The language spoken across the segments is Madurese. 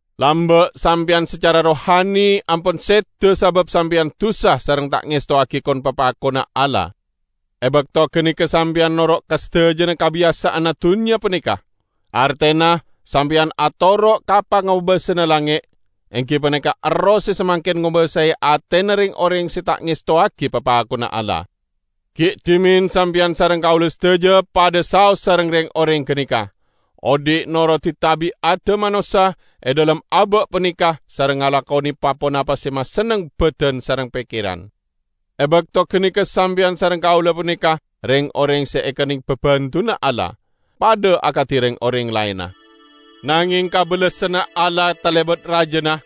Lamba' sampeyan sacara rohani ampon seda sabab sampeyan dusa sareng ta' ngestowagi kon-papakonna Allah. E bakto ganeka sampeyan noro' ka sadajana kabiyasa'anna dunnya paneka; artena sampeyan atoro' ka pangobasana langnge', enggi paneka erroh se samangken ngobasae atena reng-oreng se ta' ngestowagi papakonna Allah. Gi' dhimen sampeyan sareng kaula sadaja padha saos sareng reng-oreng ganeka, odhi' norodi tabi'adda manossa e dhalem aba' paneka sareng ngalakone pa-ponapa se masenneng badan sareng pekkeran. E bakto ganeka sampeyan sareng kaula paneka reng-oreng se ekenneng babendunna Allah, padha akadi reng-oreng laenna. Nangeng kabellasanna Allah talebat rajana!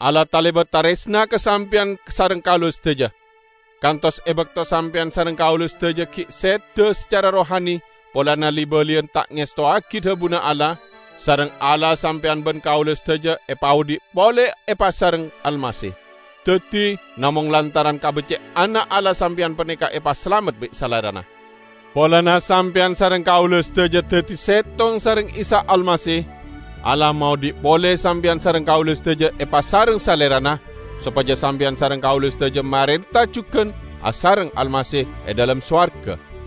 Allah talebat taresna ka sampeyan sareng kaula sadaja, kantos e bakto sampeyan sareng kaula sadaja gi' seda sacara rohani polana li-baliyan ta' ngestowagi dhabuna Allah, sareng Allah sampeyan ban kaula sadaja epaodhi' pole epasareng Almasih. Daddi, namong lantaran kabecce'anna Allah sampeyan paneka epasalamet bi' Salerana. Polana sampeyan sareng kaula sadaja daddi settong sareng Isa Almasih, Allah maodhi' pole sampeyan sareng kaula sadaja epasareng Salerana, sopaja sampeyan sareng kaula sadaja marenta jugan asareng Almasih e dhalem sowarga.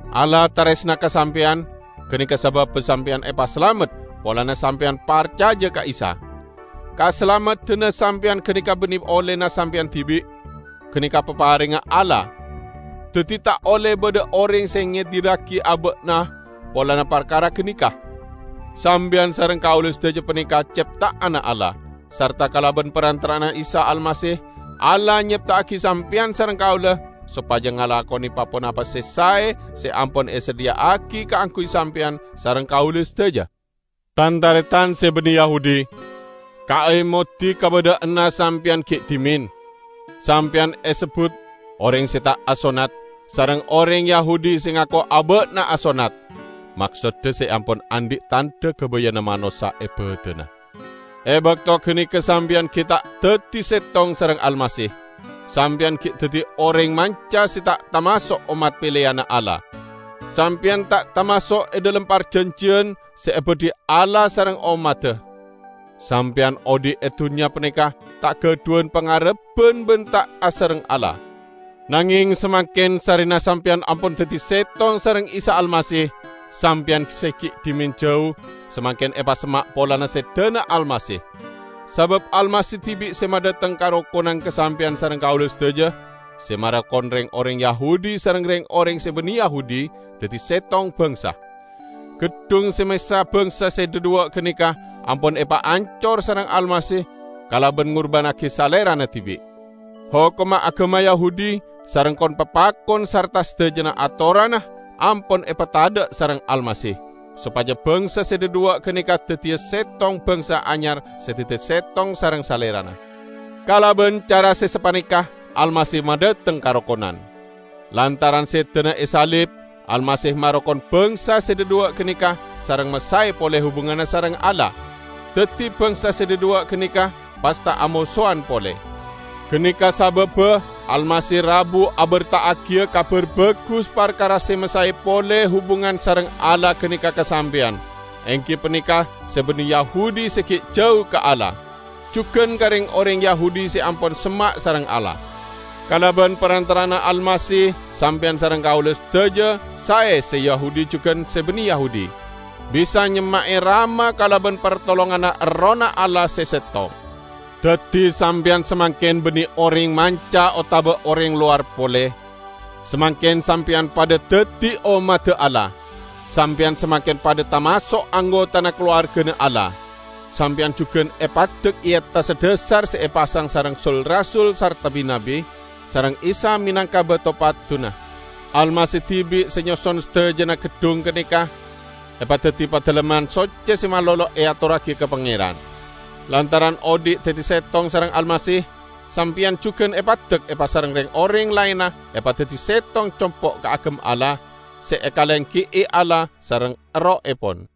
Allah taresna ka sampeyan, ganeka sababba sampeyan epasalamet polana sampeyan parcaja ka Isa. Kasalameddanna sampeyan ganeka banne ollena sampeyan dibi', ganeka paparengnga Allah. Daddi ta' olle badha oreng se ngedirragi aba'na polana parkara ganeka. Sampeyan sareng kaula sadaja paneka cepta'anna Allah; sarta kalaban parantara'anna Isa Almasih Allah nyepta'agi sampeyan sareng kaula sopaja ngalakone pa-ponapa se sae se ampon esadhiya'agi kaangguy sampeyan sareng kaula sadaja. Tan-taretan se banne Yahudi! Kaemodi kabadha'anna sampeyan gi' dhimen: Sampeyan esebbut "oreng se ta' asonnat" sareng oreng Yahudi se ngako aba'na asonnat (maksodda se ampon andhi' tandha gabayanna manossa e badanna). E bakto ganeka sampeyan gi' ta' daddi settong sareng Almasih, sampeyan gi' daddi oreng manca se ta' tamaso' ommat peleyanna Allah. Sampeyan ta' tamaso' e dhalem parjanjiyan se ebadhi Allah sareng ommadda. Sampeyan odhi' e dunnya paneka ta' gadhuwan pangarebban ban ta' asareng Allah. Nangeng samangken sarrena sampeyan ampon daddi settong sareng Isa Almasih, sampeyan se gi' dhimen jau, samangken epasemma' polana sedana Almasih. Sabab Almasih dibi' se madhateng karokonan ka sampeyan sareng kaula sadaja, se marokon reng-oreng Yahudi sareng reng-oreng se banne Yahudi daddi settong bangsa. Geddhung se mesa bangsa se dhadhuwa' ganeka ampon epaancor sareng Almasih kalaban ngurbannagi Salerana dibi'. Hokomma agama Yahudi sareng kon-papakon sarta sadajana atoranna ampon epatadha' sareng Almasih, sopaja bangsa se dhadhuwa' ganeka daddiya settong bangsa anyar se daddi settong sareng Salerana. Kalaban cara se sapaneka Almasih madhateng karokonan. Lantaran sedana e salib, Almasih marokon bangsa se dhadhuwa' ganeka, sareng masae pole hubunganna sareng Allah; daddi bangsa se dhadhuwa' ganeka pas ta' amosowan pole. Ganeka sababba Almasih rabu aberta'agiya Kabar Bagus parkara se masae pole hubungan sareng Allah ganeka ka sampeyan, enggi paneka se banne Yahudi se gi' jau ka Allah, jugan ka reng-oreng Yahudi se ampon semma' sareng Allah. Kalaban parantara'anna Almasih sampeyan sareng kaula sadaja -- sae se Yahudi jugan se banne Yahudi -- bisa nyemma'e Rama kalaban partolonganna Errohna Allah se settong. Daddi, sampeyan samangken banne oreng manca otaba oreng lowar pole. Samangken sampeyan padha daddi ommadda Allah. Sampeyan samangken padha tamaso' anggotana kalowargana Allah. Sampeyan jugan epaddek e attassa dhasar se epasang sareng sul-rasul sarta bi-nabbi, sareng Isa menangka bato padduna. Almasih dibi' se nyoson sadajana geddhong ganeka epadaddi Padalemman Socce se malolo eatorragi ka Pangeran. Lantaran odhi' daddi settong sareng Almasih, sampeyan jugan epaddek epasareng reng-oreng laenna epadaddi settong compo' kaagem Allah, se ekalenggi'i Allah sareng Errohepon.